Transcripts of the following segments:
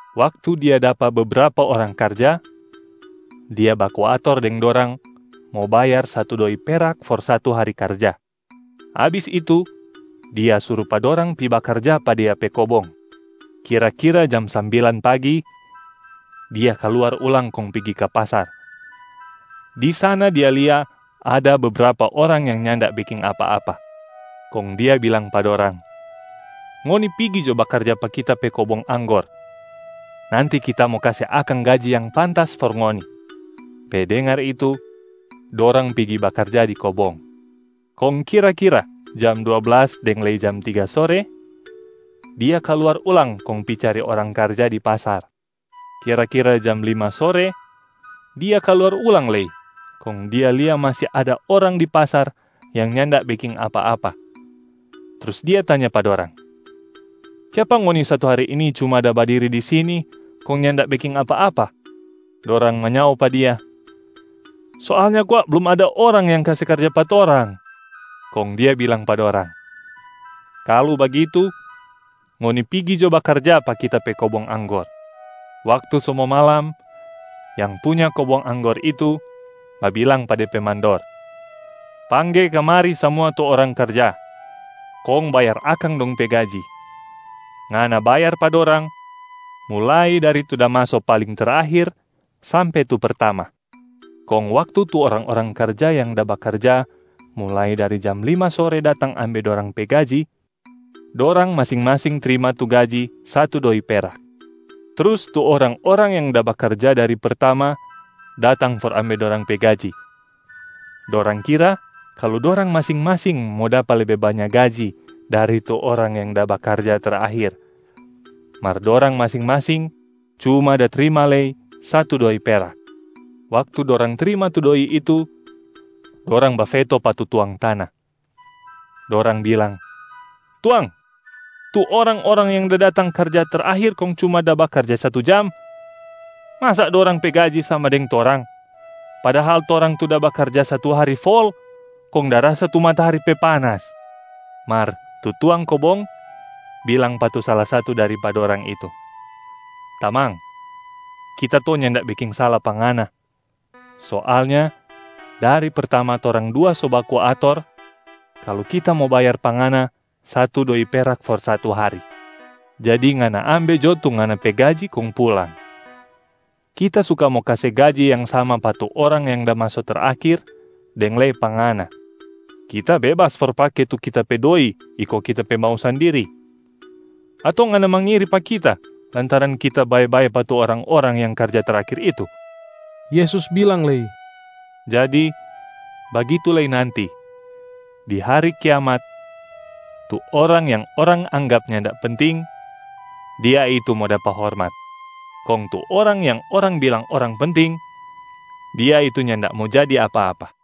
Waktu dia dapa bebrapa orang karja, dia baku ator deng dorang mo bayar satu doi perak for satu hari karja. Abis itu, dia suru pa dorang pi bakarja pa dia pe kobong. Kira-kira jam sambilan pagi, dia kaluar ulang kong pigi ka pasar. Di sana dia lia ada bebrapa orang yang nyanda beking apa-apa. Kong dia bilang pa dorang, ‘Ngoni pigi jo bakarja pa kita pe kobong anggor. Nanti kita mo kase akang gaji yang pantas for ngoni.’ Pe dengar itu, dorang pigi bakarja di kobong. Kong kira-kira jam dua blas deng lei jam tiga sore, dia kaluar ulang kong pi cari orang karja di pasar. Kira-kira jam lima sore dia kaluar ulang lei kong dia lia masi ada orang di pasar yang nyanda beking apa-apa, trus dia tanya pa dorang, ‘Kiapa ngoni satu hari ini cuma da badiri di sini kong nyanda beking apa-apa?’ Dorang manyao pa dia, ‘Soalnya kwa blum ada orang yang kase karja pa torang.’ Kong dia bilang pa dorang, ‘Kalu bagitu, ngoni pigi jo bakarja pa kita pe kobong anggor!’ Waktu so mo malam, yang punya kobong anggor itu babilang pa de pe mandor, ‘Pangge kamari samua tu orang karja kong bayar akang dong pe gaji. Ngana bayar pa dorang mulai dari tu da maso paling terakhir sampe tu pertama.’ Kong waktu tu orang-orang karja yang da bakarja mulai dari jam lima sore datang ambe dorang pe gaji, dorang masing-masing trima tu gaji satu doi perak. Trus tu orang-orang yang da bakarja dari pertama datang for ambe dorang pe gaji, dorang kira kalu dorang masing-masing mo dapa lebe banya gaji dari tu orang yang da bakarja terakhir, mar dorang masing-masing cuma da trima lei satu doi perak. Waktu dorang trima tu doi itu, dorang bafeto pa tu tuang tana. Dorang bilang, ‘Tuang, tu orang-orang yang da datang karja terakhir kong cuma da bakarja satu jam, masa dorang pe gaji sama deng torang, padahal torang tu da bakarja satu hari fol kong da rasa tu matahari pe panas.’ Mar tu tuang kobong bilang pa tu sala satu dari pa dorang itu, ‘Tamang, kita to nyanda beking sala pa ngana. Soalnya dari pertama torang dua so baku ator kalu kita mo bayar pa ngana satu doi perak for satu hari. Jadi ngana ambe jo tu ngana pe gaji kong pulang. Kita suka mo kase gaji yang sama pa tu orang yang da maso terakhir deng lei pa ngana. Kita bebas for pake tu kita pe doi iko kita pe mau sandiri. Ato ngana mangiri pa kita lantaran kita bae-bae pa tu orang-orang yang karja terakhir itu?’” Yesus bilang lei, “Jadi bagitu lei nanti di hari kiamat tu orang yang orang anggap nyanda penting, dia itu mo dapa hormat, kong tu orang yang orang bilang orang penting, dia itu nyanda mo jadi apa-apa.”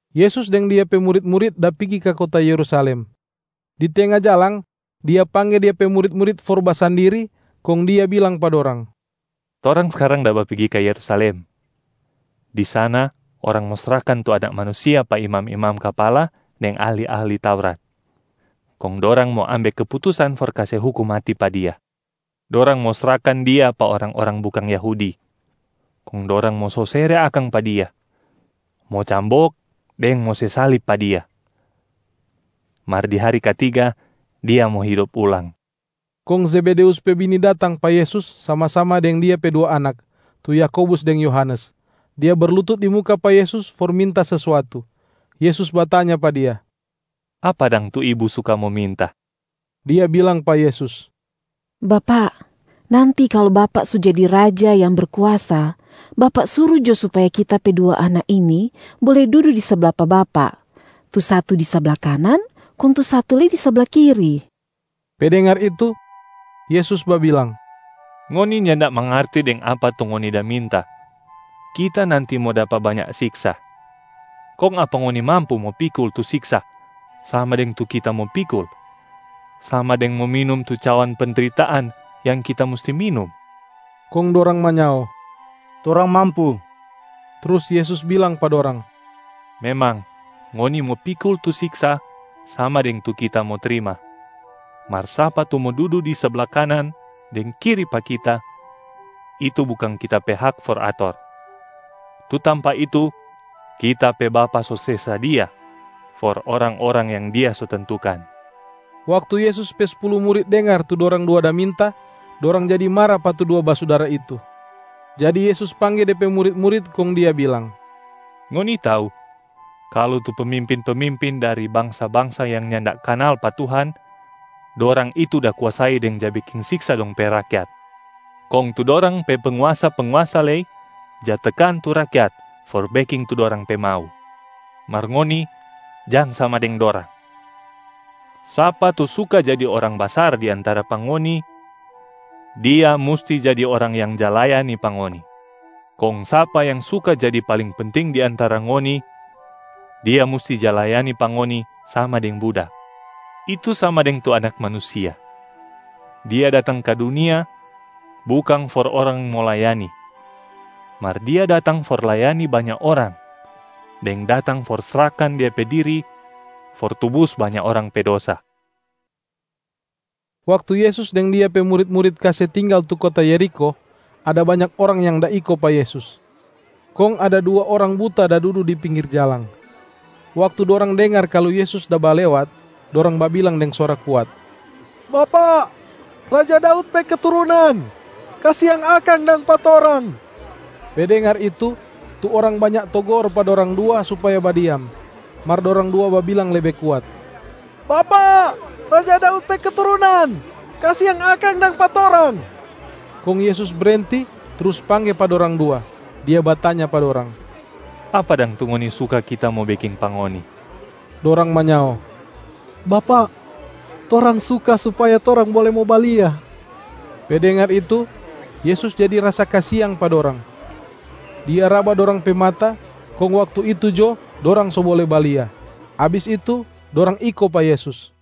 Yesus deng Dia pe murit-murit da pigi ka kota Yerusalem. Di tenga jalang Dia pangge Dia pe murit-murit for basandiri, kong Dia bilang pa dorang, “Torang skarang da bapigi ka Yerusalem. Di sana orang mo srahkan tu Anak Manusia pa imam-imam kapala deng ahli-ahli Taurat, kong dorang mo ambe keputusan for kase hukum mati pa Dia. Dorang mo srahkan Dia pa orang-orang bukang Yahudi, kong dorang mo sosere akang pa Dia, mo cambok deng mo se salib pa Dia, mar di hari katiga Dia mo hidop ulang.” Kong Zebedeus pe bini datang pa Yesus sama-sama deng dia pe dua anak, tu Yakobus deng Yohanes. Dia berlutut di muka pa Yesus for minta sesuatu. Yesus batanya pa dia, “Apa dang tu ibu suka mo minta?” Dia bilang pa Yesus, “Bapak, nanti kalu Bapak so jadi Raja yang Berkuasa, Bapa suru jo supaya kita pe dua anak ini bole dudu di sabla pa Bapak, tu satu di sabla kanan kong tu satu lei di sabla kiri.” Pe dengar itu, Yesus babilang, “Ngoni nyanda mangarti deng apa tu ngoni da minta. Kita nanti mo dapa banya siksa, kong apa ngoni mampu mo pikul tu siksa sama deng tu Kita mo pikul, sama deng mo minum tu cawan pendritaan yang Kita musti minum?” Kong dorang manyao, “Torang mampu.” Trus Yesus bilang pa dorang, “Memang ngoni mo pikul tu siksa sama deng tu Kita mo trima, mar sapa tu mo dudu di sabla kanan deng kiri pa Kita, itu bukang Kita pe hak for ator. Tu tampa itu Kita pe Bapa so se sadia for orang-orang yang Dia so tentukan.” Waktu Yesus pe spulu murit dengar tu dorang dua da minta, dorang jadi mara pa tu dua basudara itu. Jadi Yesus pangge De pe murit-murit kong Dia bilang, “Ngoni tau kalu tu pemimpin-pemimpin dari bangsa-bangsa yang nyanda kanal pa Tuhan, dorang itu da kuasai deng ja beking siksa dong pe rakyat, kong tu dorang pe penguasa-penguasa lei ja tekan tu rakyat for beking tu dorang pe mau. Mar ngoni jang sama deng dorang! Sapa tu suka jadi orang basar di antara pa ngoni, dia musti jadi orang yang ja layani pa ngoni. Kong sapa yang suka jadi paling penting di antara ngoni, dia musti ja layani pa ngoni sama deng budak. Itu sama deng tu Anak Manusia. Dia datang ka dunia bukang for orang mo layani, mar Dia datang for layani banya orang deng datang for srahkan Dia pe diri for tubus banya orang pe dosa.” Waktu Yesus deng Dia pe murit-murit kase tinggal tu kota Yerikho, ada banya orang yang da iko pa Yesus. Kong ada dua orang buta da dudu di pinggir jalang. Waktu dorang dengar kalu Yesus da balewat, dorang babilang deng suara kuat, “Bapak, raja Daud pe keturunan, kasiang akang dang pa torang!” Pe dengar itu, tu orang banya togor pa dorang dua supaya badiam. Mar dorang dua babilang lebe kuat, “Bapak, Raja Daud pe keturunan, kasiang akang dang pa torang!” Kong Yesus brenti trus pangge pa dorang dua. Dia batanya pa dorang, “Apa dang tu ngoni suka Kita mo beking pa ngoni?” Dorang manyao, “Bapak, torang suka supaya torang bole mo balia.” Pe dengar itu, Yesus jadi rasa kasiang pa dorang. Dia raba dorang pe mata kong waktu itu jo dorang so bole balia. Abis itu, dorang iko pa Yesus.